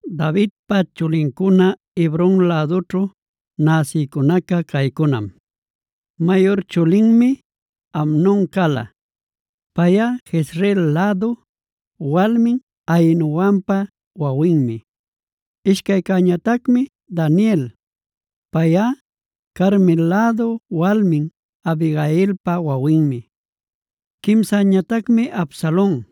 Davidpa chulincuna Hebron lädućhu näsïcunaca caycunam: Mayur chulinmi Amnon cala; payꞌa Jezreel lädu walmin Ahinoampa wawinmi. Ishcaycäñatacmi Daniel; payꞌa Carmel lädu walmin Abigailpa wawinmi. Quimsäñatacmi Absalon;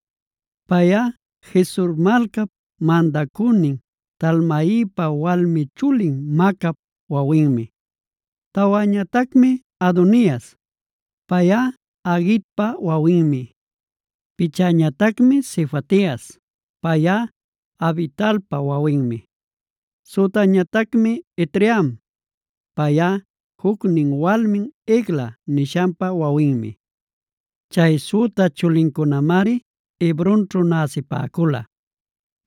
payꞌa Gesur malcap mandacünin Talmaipa walmi chulin Maacap wawinmi. Tawäñatacmi Adonias; payꞌa Haguitpa wawinmi. Pichäñatacmi Sefatias; payꞌa Abitalpa wawinmi. Sütäñatacmi Itream; payꞌa jucnin walmin Egla nishanpa wawinmi. Chay süta chulincunamari Hebronćhu näsipäcula,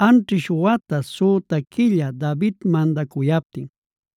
anćhish wata süta quilla David mandacuyaptin.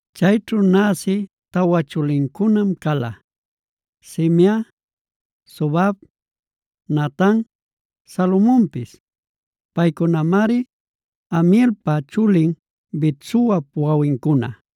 Chayćhu näsï tawa chulincunam cala: Simea, Sobab, Natan, Salomonpis; paycunamari Amielpa chulin Bet-suapb wawincuna.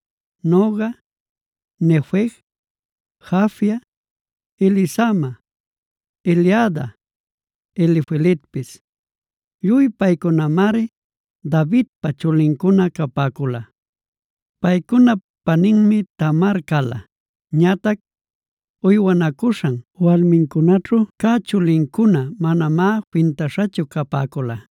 Noga, Nefeg, Jafia, Elisama, Eliada, Elifeletpis. Lluy paycunamari Davidpa chulincuna capäcula. Paycunap paninmi Tamar cala. Ñatac uywanacuśhan walmincunaćhu cä chulincuná manamá fintaśhachu capäcula.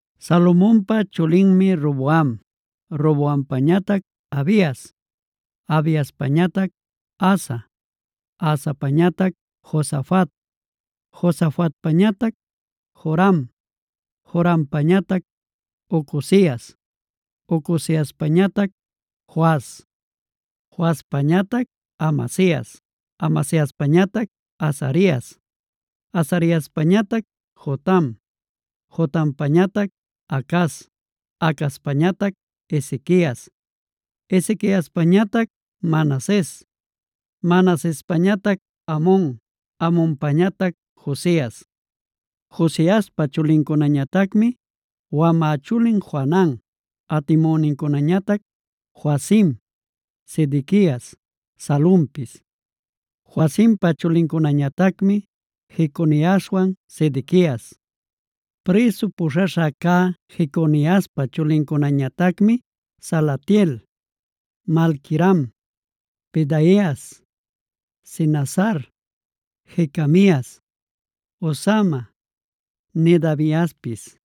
Salomonpa chulinmi Roboam, Roboampañatac Abias, Abiaspañatac Asa, Asapañatac Josafat, Josafatpañatac Joram, Jorampañatac Ocozias, Ocoziaspañatac Joas, Joaspañatac Amasias, Amasiaspañatac Azarias, Azariaspañatac Jotam, Jotampañatac Acaz, Acazpañatac Ezequias, Ezequiaspañatac Manases, Manasespañatac Amon, Amonpañatac Josias. Josiaspa chulincunañatacmi: wamä chulin Johanan, atimünincunañatac Joacim, Sedequias, Salumpis. Joacimpa chulincunañatacmi Jeconiaswan Sedequias. Prïsu puśhaśha cä Jeconiaspa chulincunañatacmi: Salatiel, Malquiram, Pedaias, Senazar, Jecamias, Hosama, Nedabiaspis.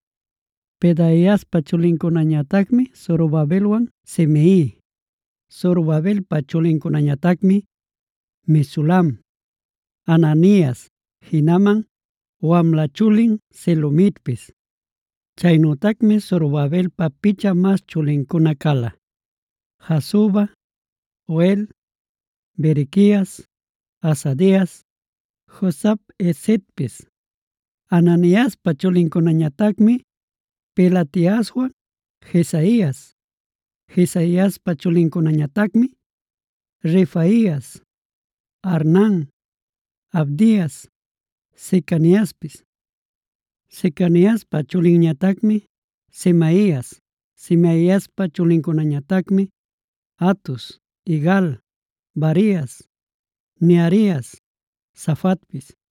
Pedaiaspa chulincunañatacmi Zorobabelwan Simei. Zorobabelpa chulincunañatacmi: Mesulam, Hananias, jinaman wamla chulin Selomitpis. Chaynütacmi Zorobabelpa picha mas chulincuna cala: Hasuba, Ohel, Berequias, Hasadias, Jusab-hesedpis. Hananiaspa chulincunañatacmi Pelatiaswan Jesaias. Jesaiaspa chulincunañatacmi: Refaias, Arnan, Abdias, Secaniaspis. Secaniaspad chulinñatacmi Semaias. Semaiaspa chulincunañatacmi: Hatus, Igal, Barias, Nearias, Safatpis.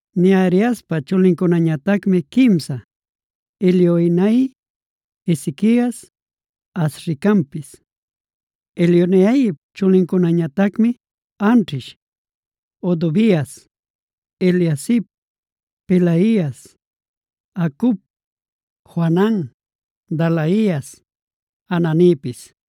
Neariaspa chulincunañatacmi quimsa: Elioenai, Ezequias, Azricampis. Elioenaip chulincunañatacmi anćhish: Hodovias, Eliasib, Pelaias, Acub, Johanan, Dalaias, Ananipis.